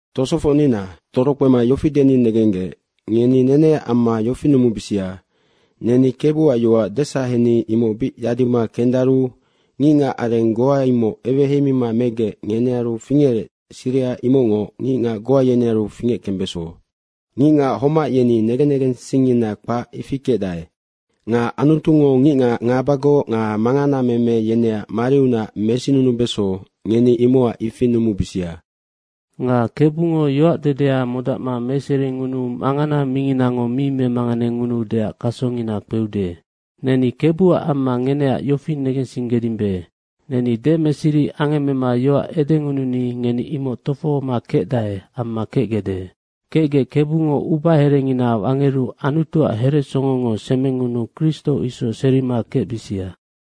Tosofocnina, torokpema yofi deni negenggec, ngeni neneac amma yofi numubisia, neni Kebuac yoac desaheni imoc bic yadima kendaru ngicngac areng goa imoc eweheima megec, ngenearu fingerec, siriha imocngoc ngicngac goa yenearu fingeckembeso. Ngicngac homac yeni negen negensingngina kpac, ifi kecdae. Nga Anutungo ngicngac ngabagoc nga manganameme yeneac mariunac mesinunubeso, ngeni imocac ifi numubisia. Nga Kebungo yoacdedea modacma meseringunuu mangana minginango mi memanganengunuudeac kasongina kpeude. Neni Kebuac amma ngeneac yofi negensinggedimbe, Neni demeseri angemmema yoac edengununi ngeni imoc tofohoma kecdae amma kecgecde. Kecgec Kebungo ubaherengina wangeru Anutuac heresongongo semengunuu Kristo isoc serima kecbisia.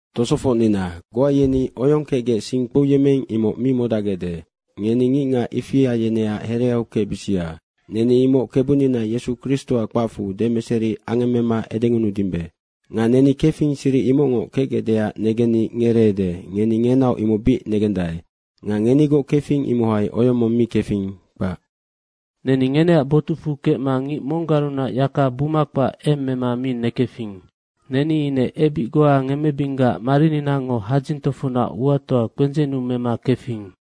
Tosofocnina, goa yeni oyong kecgec sing kpouyemmeing, imoc mi modacgecde. Ngeni ngicngac ifia yeneac hereau kecbisia. Neni imoc Kebunina Yesu Kristoac kpacfu demeseri angemmema edengunudimbe. Nga neni kefing, siric imocngoc kecgecdeac negenni ngereede, ngeni ngenaoc imoc bic negendae. Nga ngenigoc kefing, imohai oyong mong mi kefing, kpac. Neni ngeneac botucfu kecma ngic monggarunac yaka buma kpac eng mema mi nekefing. Neni ine ebic goa ngemmebinggac marininango hadzing tofocnac uatoa kpendzennu mema kefing.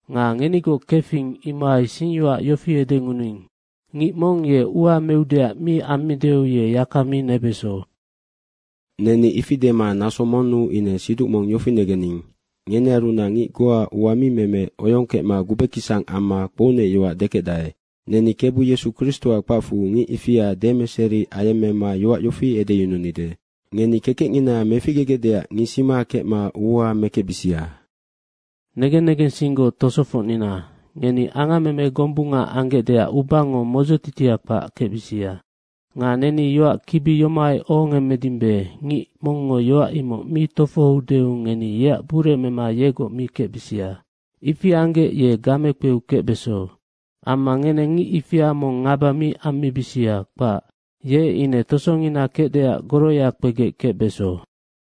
Nga ngenigoc kefing, imohai singyoac yofi edengunuing, “Ngic mong ye ua meudeac mi ammideu, ye yaka mi nebeso.” Neni ifi dema naso monnu ine siduc mong yofi negening, ngenearunac ngic goa ua mi meme oyong kecma gubekisang amma kpounecyoac dekecdae. Neni Kebu Yesu Kristoac kpacfu ngic ifia demeseri ayemmema yoac yofi edeyununide, “Ngeni kekecngina meficgegecdeac ngisima kecma ua mekecbisia.” Negen negensinggoc tosofocnina, ngeni angammeme gombunga anggecdeac ubango modzotitia kpac kecbisia. Nga neni yoac kibi yomohai ohongemmedimbe, ngic mongngo yoac imoc mi tofohoudeu ngeni yeac buremema yegoc mi kecbisia. Ifi anggec ye gamekpeu kecbeso. Amma ngeneng ngic ifia mong ngaba mi ammibisia, kpac. Ye ine tosongina kecdeac goroya kpegec kecbeso.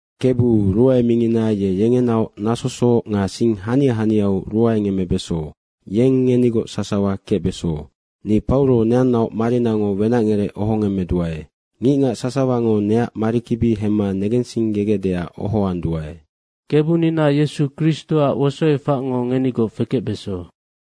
Kebu ruae mingina ye yengenaoc nasosoc nga sing hania haniau ruae ngemmebeso. Yeng ngenigoc sasawa kecbeso. Ni Pauro neannaoc marinango wenacngerec ohongemmeduae. Ngicngac sasawango neac marikibi hemma negensinggegecdeac ohoanduae. Kebunina Yesu Kristoac wosoefacngo ngenigoc fekecbeso.